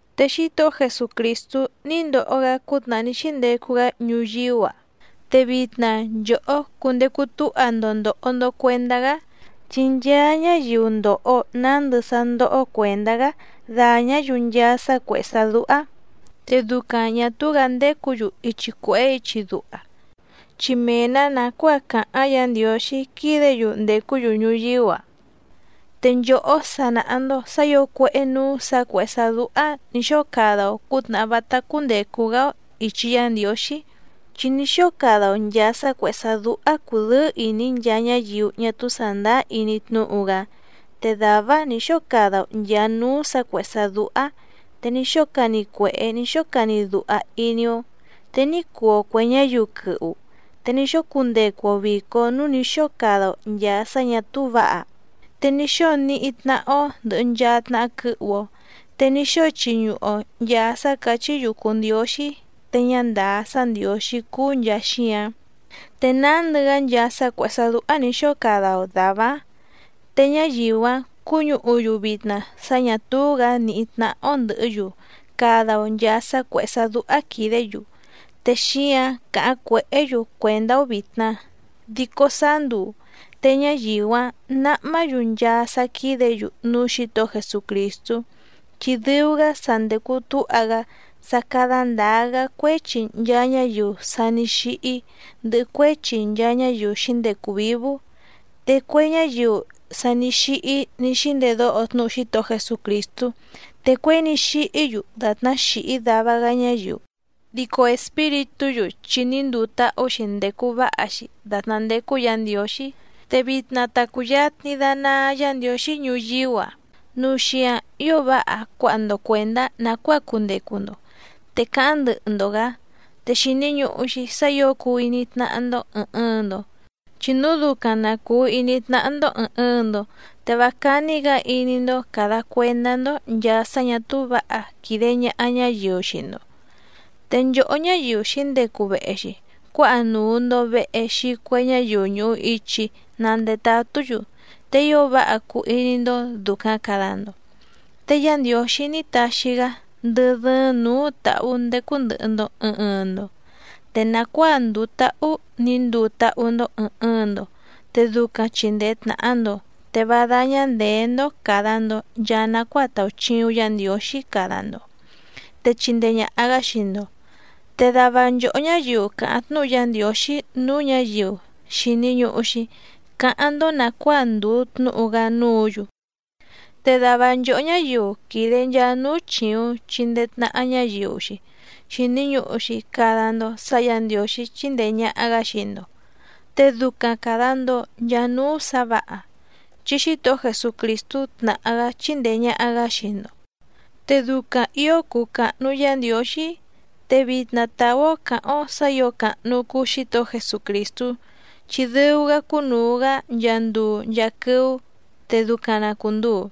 Te Xítohó Jesucrìstú ní ndoho‑gá cútnàhá ní xíndecu‑gá ñuyíú‑a, te vitna nchòhó cundecu túha‑ndo ndòho‑ndo cuendá‑gá, chi nchaa ñáyiu ndòho nándɨ sá ndóhó cuèndá‑gá dàñá‑yu nchaa sá cuèhé sá dúhá. Te ducaⁿ ñà túú‑gǎ ndécǔ‑yu ichi cuèhé ichi duha, chi mee‑nǎ nàcuáa càháⁿ Yǎ Ndiǒxí quídě‑yu ndècú‑yu ñuyíú‑a. Te nchòhó sa nàha‑ndo sá ǐo cuéhé nǔú sǎ cuèhé sá dúhá nǐ xóo cada‑o cǔtnàhá vátá cúndècu‑gá‑ó ìchi Yá Ndiǒxí, chi ní xóo cada‑o nchàa sá cuèhé sá dúhá cùdɨ́ɨ́ ìní nchaa ñáyiu ñá túú sàndáá iní tnúhu‑gá, te dàvá‑áⁿ nǐ xóo cada‑o nchàa núú sǎ cuèhé sá dúhá, te ní xóo cani cuèhé ní xóo cani duha iní‑ó, te ní cuu‑o cuè ñáyiu quɨhu, te ní xóo cundecu‑o vìco núú nǐ xóo cada‑o nchàa sá ñà túú vǎha, te ní xóo níhí tnáhá‑ó ndɨ̀hɨ nchaa tnaha quɨhu‑o, te ní xóo chiñuhu‑o nchàa sá càchí‑yu cùu ndióxí te ñá ndàá sá ndiǒxí cúú nchàa xíǎⁿ, te nándɨ‑gá nchaa sá cuèhé sá dúhá nǐ xóo cada‑o dàvá‑áⁿ. Te ñáyiu‑áⁿ cúñǔhu‑yu vitna sá ñà túú‑gǎ nìhí tnáhá‑ó ndɨ̀hɨ́‑yu cada‑o nchàa sá cuèhé sá dúhá quìdé‑yu, te xíǎⁿ càháⁿ cuèhé‑yu cuèndá‑ó vìtna. Dico sáá nduu te ñáyiu‑áⁿ nǎhmá‑yu nchaa sá quídě‑yu núú Xǐtohó Jesucrìstú, chi dɨu‑gá sa ndècu túha‑gá sá cádá ndǎá‑gá cuéchi nchaa ñáyiu sa ní xíhí, ndɨhɨ cuéchi nchaa ñáyiu xǐndecu vǐvú. Te cue ñáyiu sa ní xíhí ní xíndedóho tnúhu Xítohó Jesucrìstú, te cuěi ní xíhí‑yu dàtná xìhí dava‑gá ñáyiu, dico espíritú‑yu chi ní nduu táhú‑xi ndècu váha‑xi dàtná ndécú Yǎ Ndiǒxí. Te vitna ta cùyatni danaa Yá Ndiǒxí ñuyíú‑a núu xíǎⁿ ío váha cuáha‑ndo cuèndá nàcuáa cundecu‑ndo, te cáháⁿ ndɨhɨ‑ndo‑gǎ. Te xìni ñuhu‑xi sá ǐo cuu iní tnáhá‑ndó ɨ̀ɨⁿ ɨɨⁿ‑ndo, chi núu ducaⁿ na cùu iní tnáhá‑ndó ɨ̀ɨⁿ ɨɨⁿ‑ndo, te vá cání‑gǎ iní‑ndó càda cuendá‑ndó nchàa sá ñà túú vǎha quìde ñaha ñáyiu xii‑ndo, te nchòhó ñáyiu xǐndecu vehe‑xi cuáha nùu‑ndo vehe xii cue ñáyiu ñùhu ichi na ndetatú‑yu, te ío váha cuu iní‑ndó dùcaⁿ cada‑ndo. Te Yá Ndiǒxí ní taxi‑gá ndɨ́ dɨ́ɨ́ⁿ nǔú tǎhú ndécú ndɨ̀hɨ‑ndo ɨɨⁿ ɨɨⁿ‑ndo, te nàcuáa ndùu táhú nǐ nduu táhú‑ndó ɨ̀ɨⁿ ɨɨⁿ‑ndo te ducaⁿ chìndee tnaha‑ndo, te vá dáñá ndèé‑ndó càda‑ndo nchaa nacuáa tàuchiuⁿ Yá Ndiǒxí cada‑ndo, te chindee ñàha‑gá xii‑ndo. Te dava nchòhó ñáyiu càháⁿ tnúhu Yá Ndiǒxí núú ñǎyiu, xìni ñuhu‑xi cáháⁿ‑ndó nàcuáa ndùu tnúhu‑gá núǔ‑yu, te dava nchòhó ñáyiu quìde nchaa núú chìuⁿ chindee tnaha ñáyiu‑xi, xìni ñuhu‑xi cada‑ndo sá Yǎ Ndiǒxí chíndèe ñaha‑gá xii‑ndo, te ducaⁿ càda‑ndo nchaa núú sǎ vǎha, chi Xítohó Jesucrìstú tnàhá‑gá chíndèe ñaha‑gá xii‑ndo, te ducaⁿ ǐo cuu càhnu Yá Ndiǒxí. Te vitna tàú‑ó cǎháⁿ‑ó sǎ ǐo càhnu cuu Xítohó Jesucrìstú, chi dɨu‑gá cúnùu‑gá nchaa nduu nchaa quɨ́ú, te ducaⁿ na cùnduu.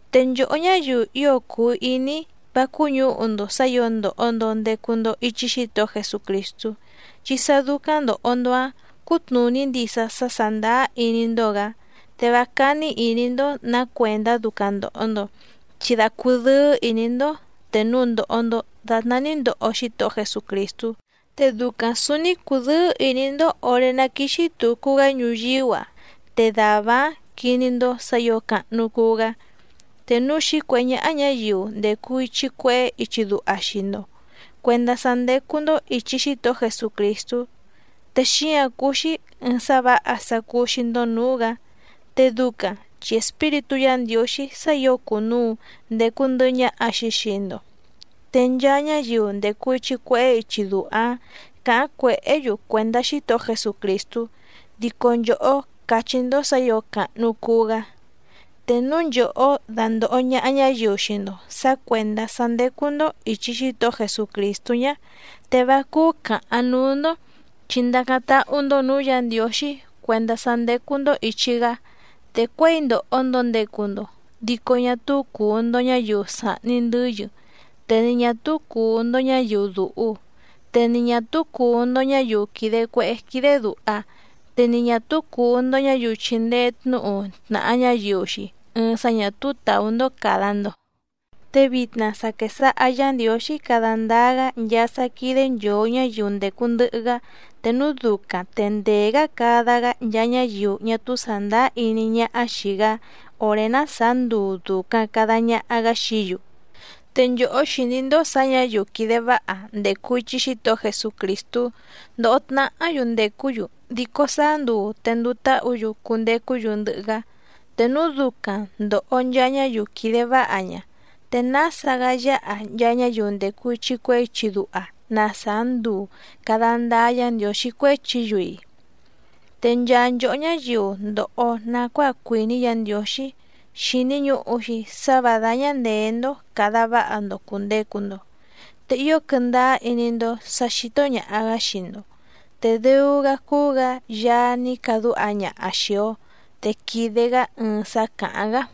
Te nchòhó ñáyiu ío cùu iní‑í, vá cúñǔhu‑ndo sǎ ǐo ndòho‑ndo ndecu‑ndo ichi Xítohó Jesucrìstú, chi sá dúcáⁿ ndòho‑ndo‑áⁿ cútnùní ndisa sá sàndáá iní‑ndó‑gǎ, te vá cání ìní‑ndó nǎ cuèndá ducaⁿ ndòho‑ndo. Chi da cudɨ́ɨ́ ìní‑ndó te núu ndòho‑ndo datná ní ndoho Xítohó Jesucrìstú, te ducaⁿ sǔúní cùdɨ́ɨ́ ìní‑ndó òré ná quìxi tucu‑gá ñuyíú‑a te dàvá‑áⁿ quiní‑ndó sǎ ǐo càhnu cuu‑gá. Te núu xǐcuèhé ñáhá ñǎyiu ndècu ichi cuehé ichi duha xii‑ndo cuèndá sá ndécú‑ndó ìchi Xítohó Jesucrìstú, te xíǎⁿ cúú‑xí ɨ̀ɨⁿ sá vǎha sá cúú‑xí‑ndó nǔú‑gǎ, te ducaⁿ chi Espíritú Yǎ Ndiǒxí sá ǐo cùnuu ndecu ndɨhɨ ñaha‑xi xii‑ndo, te nchaa ñáyiu ndècu ichi cuehé ichi duha‑ǎⁿ càháⁿ cuèhé‑yu cuèndá Xítohó Jesucrìstú, dico nchòhó càchí‑ndó sǎ ǐo càhnu cuu‑gá. Te núu nchòhó dándòho ñaha ñáyiu xii‑ndo sǎ cuèndá sá ndécú‑ndó ìchi Xítohó Jesucrìstú ñá, te vá cúú càháⁿ núú‑ndó, chi ndacáⁿ táhú‑ndó nǔú Yǎ Ndiǒxí cuèndá sá ndécú‑ndó ìchi‑gá. Te cuěi ndòho‑ndo ndecu‑ndo, dico ñá túú cùu‑ndo ñáyiu sàhni ndɨ́yɨ te ni ñà túú cùu‑ndo ñáyiu dùhu, te ni ñà túú cùu‑ndo ñáyiu quìde cuehé quídé dùha, te ni ñà túú cùu‑ndo ñáyiu chìndee tnúhu tnàha ñáyiu‑xi ɨɨⁿ sá ñà túú tàú‑ndó càda‑ndo. Te vitna sa quèsaha Yá Ndiǒxí cada ndáá‑gá nchaa sá quídé nchòo ñáyiu ndècu ndɨhɨ‑gá, te núu ducaⁿ te ndèé‑gá cada‑gá nchaa ñáyiu ñá túú sàndáá iní ñáhá xìi‑gá òré ná sàá nduu dùcaⁿ cada ñaha‑gá xií‑yu. Te nchòhó xìní‑ndó sǎ ñǎyiu quìde váha ndècu ichi Xítohó Jesucrìstú ndòho tnahá‑yu ndècú‑yu, dico sáá nduu te nduu táhǔ‑yu cundecú‑yu ndɨhɨ‑gá. Te núu ducaⁿ ndòho nchaa ñáyiu quìde váha ña, ¿te nása‑gá yáha nchaa ñáyiu ndècu ichi cuehé ichi duha na sàá nduu càda ndáá Yǎ Ndiǒxí cuéchi‑yu‑i? Te nchaa nchòhó ñáyiu ndòho nacuáa cuìní Yǎ Ndiǒxí xìni ñuhu‑xi sá vǎ dáñá ndèé‑ndó càda váha‑ndo cùndecu‑ndo, te ío quɨndáá iní‑ndó sǎ xító ñàha‑gá xii‑ndo. Te dɨu‑gá cúú‑gǎ Yaá ní cadúha ñaha xìi‑o, te quìde‑gá ɨɨⁿ sá càháⁿ‑gá.